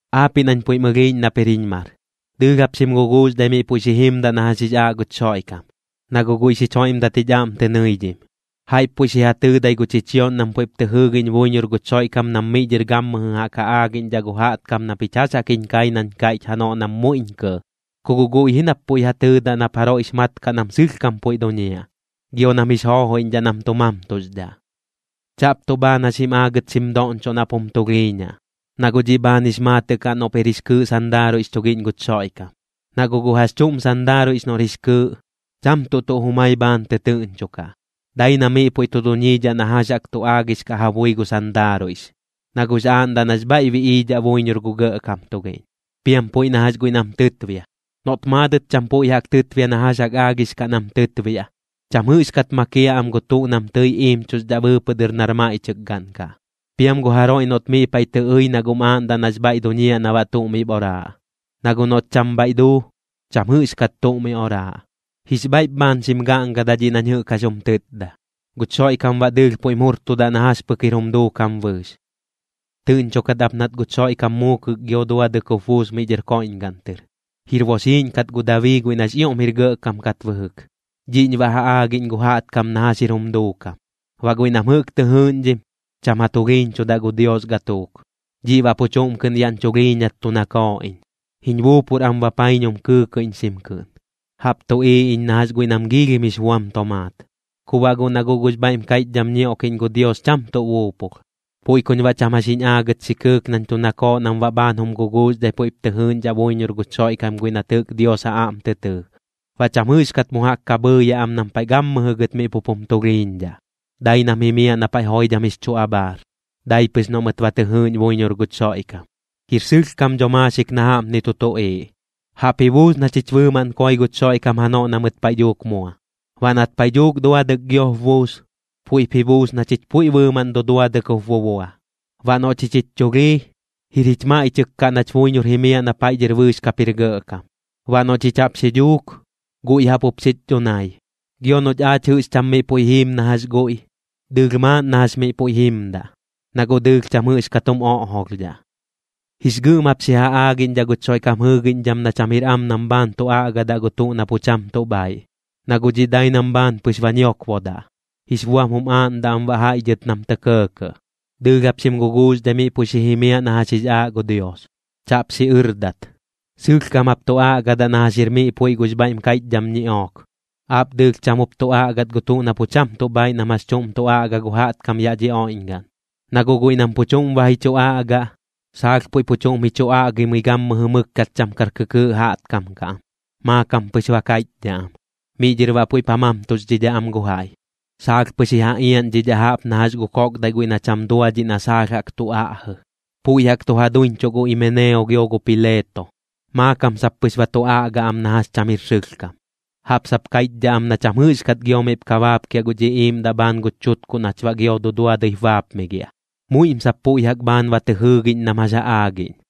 Aapiꞌ nañ puiꞌm ɨlhiiꞌñ nap jir jiñ mar, dɨɨlh jap xim guguuxdhai miꞌ puiꞌ xi jimdaꞌ na jax jix aaꞌ guch Xoiꞌkam, na guꞌ guiꞌ xich joiꞌmdat jich aꞌm tɨ nɨidhim. Jaiꞌp puiꞌ xi ja tɨɨdai gu chichioꞌñ nam puiꞌp tɨ jɨɨgiꞌñ buiñor guch Xoiꞌkam nam miꞌ dhɨr gammɨjɨ jaꞌk ja aagiꞌñdhaꞌ gu jaꞌtkam na pich jax jaꞌk jiñ kai nañ kaiꞌch janoꞌ nam muiꞌñ kɇɇ, ku guꞌ guiꞌ ji nap pu ja tɨɨdaꞌ nap jaroiꞌx ja mat kaꞌ nam sɨlhkam puiꞌ duñiaꞌ, gio nam jix joojoiꞌñdhaꞌ nam tu mamtuxdhaꞌ. Chaꞌp tuꞌ bhaan jax jim aagɨt xim doꞌñchoꞌ nap jum tulhiiñaꞌ, na guꞌ dhiꞌ bhaan jix maatɨꞌ kaꞌ noꞌp jir jix kɨɨꞌ sandaaruiꞌx chugiꞌñ guch Xoiꞌkam. Na guꞌ gu jax chuꞌm sandaaruiꞌx noꞌr jix kɨɨꞌ, cham tuꞌ tuꞌ jumai bhaan tɨtɨɨꞌñchokaꞌ, dai na miꞌ puiꞌ tu duñiidhaꞌ na jax jaꞌk tu aagix kaꞌ ja bui gu sandaaruiꞌx, na guꞌx aaꞌndaꞌ nax bhaiꞌ biꞌiidhaꞌ buiñor gu gɇꞌkam tugiꞌñ. Piam puiꞌ na jax guiꞌ nam tɨtbia, noꞌt maadɨt cham puiꞌ jaꞌk tɨtbia na jax jaꞌk aagix kaꞌ nam tɨtbiaꞌ, cham jɨꞌxkat makiaꞌ am gu tuꞌ nam tɨi iimchuxdhaꞌ bɨɨpɨꞌ dɨr nar maiꞌchɨkgaꞌn kaꞌ. Piam gu jaroiꞌ noꞌt miꞌ paiꞌ tɨ ɨi na guꞌm aaꞌndaꞌ nax bhaiꞌ duñiaꞌ na baꞌ tuꞌ miꞌp oraaꞌ. Na guꞌ noꞌt cham bhaiꞌ duu, cham jɨꞌxkat tuꞌ mi oraaꞌ. Jix bhaiꞌp bhaan xim gaꞌngadaꞌ dhiꞌ nañ jɨꞌk jax jum tɨtda, guch Xoiꞌkam baꞌ dɨɨlh puiꞌm jurtudaꞌ na jax pɨk jir jum duukam bɨɨx. Tɨꞌñchokat ap nat guch Xoiꞌkam muukɨk gio duadɨk jup buus miꞌ dhɨr koiꞌñgaꞌn tɨr. Jir boxiiꞌñ kat gu Dabii guiꞌ nax ioꞌm jir gɇꞌkam kat bɨjɨk. Dhiꞌñ baꞌ ja aagiꞌñ gu jaꞌtkam na jax jir jum duukam. Baꞌ guiꞌ nam jɨꞌk tɨ jɨɨꞌñdhim, cham ja tulhiiñchudaꞌ gu Dios gatuuk. Dhiꞌ baꞌ pu chuꞌm kɨꞌn yaꞌñ chulhiiñat tu nakooꞌ iñ. Jiñ buupur am bapaiñum kɨɨkɨiꞌñxim kɨꞌn, jaꞌp tuꞌiiꞌ iñ na jax guiꞌ nam giilhim jix buam tomaat. Ku baꞌ guꞌ na guꞌ gux bhaiꞌm kaiꞌchdham ñioꞌkiꞌñ gu Dios cham tuꞌ buupulh. Puiꞌ kuñ baꞌ cham jax jiñ aagɨt xi kɨɨk nañ tu nakooꞌ nam baꞌ bhaan jum guguuxdhai puiꞌp tɨ jɨɨꞌñdhaꞌ buiñor guch Xoiꞌkam guiꞌ nat jɨꞌk Dios ja aꞌm tɨ tɨɨ. Baꞌ cham jɨꞌxkat mu jaꞌk ka bhɨɨyaꞌ am nam paiꞌ gammɨjɨ gɨt miꞌ pup jum tulhiiñdhaꞌ, dai nam jimiaꞌ na paiꞌ joidham jix chu abhaar, dai pɨx noꞌ mɨt ba tɨ jɨɨꞌñ buiñor guch Xoiꞌkam. Jir sɨlhkam dho maaxik na jaꞌpni tu tuꞌiiꞌ: Jaꞌp ji buus na chich bɨɨmaꞌn koi guch Xoiꞌkam janoꞌ na mɨt paiꞌ dhuuk mua. Baꞌ nat paiꞌ dhuuk duadɨk giop buus, puiꞌp ji buus na chich puiꞌ bɨɨmaꞌn duduadɨk jup bubua. Baꞌ noꞌ chich jich chulhii, jir jich maiꞌchɨk kaꞌ nach buiñor jimiaꞌ na paiꞌ dhɨr bɨɨx kap jir gɇꞌkam. Baꞌ noꞌ chich jaꞌp xi dhuuk, guiꞌ jaꞌp jup xich dhunai. Gio noꞌch aach jɨꞌx cham miꞌ puiꞌ jiim na jax guiꞌ, dɨɨlh maaꞌn na jax miꞌ puiꞌ jimdaꞌ, na guꞌ dɨɨlh cham jɨꞌxkat jum oꞌjolhdhaꞌ. Jix gɨꞌm jap xi ja aagiꞌñdhaꞌ guch Xoiꞌkam jɨɨgiꞌñdham na cham jir am nam bhaan tu aꞌgadaꞌ gu tuꞌ na pu cham tuꞌ bhaiꞌ. Na guꞌ dhiꞌ dai nam bhaan pɨx ba ñiokbodaꞌ, jix buam jum aaꞌndaꞌ am baꞌ jaiꞌ dhɨt nam tɇ kɇɇkɇꞌ. Dɨɨlh jap xim guguuxdhai miꞌ puiꞌ xi jimiaꞌ na jax jix aaꞌ gu Dios, chaꞌp xiꞌɨrdat. Sɨlhkam jap tu aꞌgadaꞌ na jax jir miꞌ puiꞌ gux bhaiꞌm kaiꞌchdham ñiꞌook. Aap dɨɨlh cham jup tu aꞌgat gu tuꞌ na pu cham tuꞌ bhaiꞌ nam jax chuꞌm tu aꞌga gu jaꞌtkam yaꞌ dhi oiꞌñgaꞌn. Na guꞌ guiꞌ nam pu chuꞌm ba ji chu aꞌgaꞌ, saalh puiꞌ pu chuꞌm ji chu aꞌgimɨi gammɨjɨ mɨkkat cham kar kɨkɨɨꞌ jaꞌtkam kaꞌ am, maakam pɨx ba kaiꞌchdhaꞌ am. Miꞌ dhɨr baꞌ puiꞌp ja mamtuxdhidhaꞌ am gu jaiꞌ, saalh pɨx ji ja iaꞌñdhidhaꞌ jaꞌp na jax gu koꞌkdaiꞌ guiꞌ na cham duadhiꞌ na saalh jaꞌk tu aꞌjɨ. Puiꞌ jaꞌk tu ja duiñchuꞌ gu Imeneo gio gu Pileeto. Maakam sap pɨx ba tu aꞌga am na jax cham jir sɨlhkam, jaꞌp sap kaiꞌchdhaꞌ am na cham jɨꞌxkat gio miꞌp ka baapkiaꞌ guch iꞌiiꞌmdaꞌ bhaan guch chutkuꞌ nach baꞌ gio duduadɨip baapmigiaꞌ. Muiꞌm sap puiꞌ jaꞌk bhaan ba tɨ jɨɨgiꞌñ nam jax ja aagiꞌñ.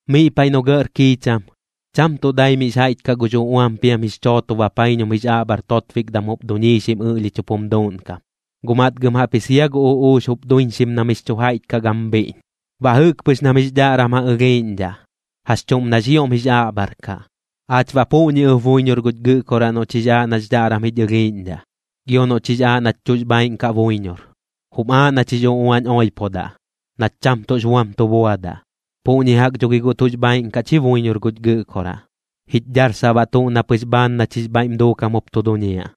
Miꞌ paiꞌ noꞌ gɇꞌr kiicham, cham tuꞌ dai mix jaiꞌch kaꞌ gux uꞌuam piam jix chooto bapaiñum jix aꞌbhar totbikdam jup duñiixim ɨꞌlhich jup jum duuꞌnkam, guꞌ matgɨm jaꞌpji sia gu uꞌuux jup duiñxim na mix chu jaiꞌch kaꞌ gam bhiꞌñ. Baꞌ jɨꞌk pɨx nam jix dhaꞌram ja ɨlhiiꞌñdhaꞌ, jax chuꞌm nax ioꞌm jix aꞌbhar kaꞌ. Aach baꞌ puꞌñi ɨp buiñor guch Gɨꞌkoraꞌ noꞌch jix aaꞌ nax dhaꞌram jich ɨlhiiꞌñdhaꞌ, gio noꞌch jix aaꞌ nach tuꞌx bhaaiꞌn kaꞌ buiñor, jum aaꞌ nach jix uꞌuañ oipodaꞌ, nach cham tuꞌx buam tu buadaꞌ. Puꞌñi jaꞌk dho gi guꞌ tuꞌx bhaaiꞌn kaꞌch ji buiñor guch Gɨꞌkoraꞌ, jich dharsaꞌ baꞌ tuꞌ na pɨx bhaan nach jix bhaiꞌm duukam jup tu duñiaꞌ.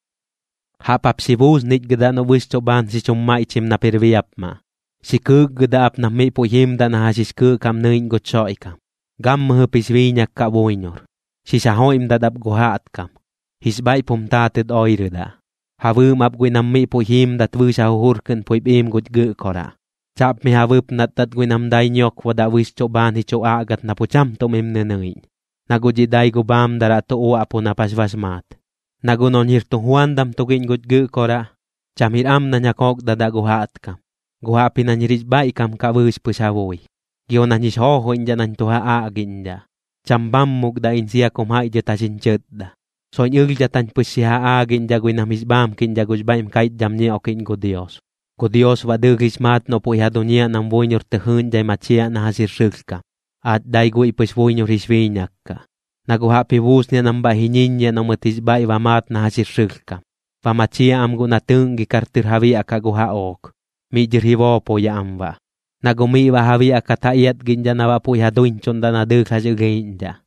Jaꞌp jap xi buusnichgɨdaꞌ noꞌ bɨxchuꞌ bhaan xi chum maiꞌchim nap jir biapmaꞌ. Xi kɨɨkgɨdaꞌ ap nap miꞌ puiꞌ jimdaꞌ na jax jix kɨɨꞌ kaꞌm nɨiꞌñ guch Xoiꞌkam, gammɨjɨp jix biiñak kaꞌ buiñor, xix ja joiꞌmdat ap gu jaꞌtkam. Jix bhaiꞌp jum taatɨt oirɨdaꞌ, ja bɨɨm ap guiꞌ nam miꞌ puiꞌ jiimdat bɨɨx ja jujur kɨꞌn puiꞌp iim guch Gɨꞌkoraꞌ. Chaꞌp mi ja bɨpnatdat guiꞌ nam dai ñiokbodaꞌ bɨxchuꞌ bhaan ji chu aꞌgat na pu cham tuꞌ mim nɨnɨiꞌñ, na guꞌ dhiꞌ dai gu bhaamdaraꞌ tu uaꞌpu nap jax bax maat. Na guꞌ noꞌñ jir tujuandam tugiꞌñ guch Gɨꞌkoraꞌ, cham jir am nañ ja kokdadaꞌ gu jaꞌtkam, guꞌ jaꞌpji nañ jir jix bhaiꞌkam kaꞌ bɨɨx pɨx ja bui, gio nañ jix joojoiꞌñdhaꞌ nañ tu ja aꞌgiꞌñdhaꞌ. Cham bhammukdaꞌ iñ sia kum jaiꞌ dhɨt jax jiñ chɨtda. Soiꞌñ ɨlhdhat jañ pɨx xi ja aagiꞌñdhaꞌ guiꞌ nam jix bhaamkiꞌñdhaꞌ gux bhaiꞌm kaiꞌchdham ñioꞌkiꞌñ gu Dios. Gu Dios baꞌ dɨɨlh jix maat noꞌ puiꞌ ja duñiaꞌ nam buiñor tɨ jɨɨꞌñdhai machiaꞌ na jax jir sɨlhkam, aach dai guiꞌ pɨx buiñor jix biiñak kaꞌ. Na guꞌ jaꞌp ji buusniaꞌ nam bhaiꞌ ji ñiññiaꞌ noꞌ mɨt jix bhaiꞌ ba maat na jax jir sɨlhkam, ba machiaꞌ am guꞌ na tɨɨꞌngikar tɨr ja biaꞌkaꞌ gu jaꞌook. Miꞌ dhɨr ji boopoyaꞌ am baꞌ, na guꞌ miꞌ baꞌ ja biaꞌkat ja iatgiꞌñdhaꞌ na baꞌ puiꞌ ja duiñchuꞌndaꞌ na dɨɨlh jax ɨlhiiꞌñdhaꞌ.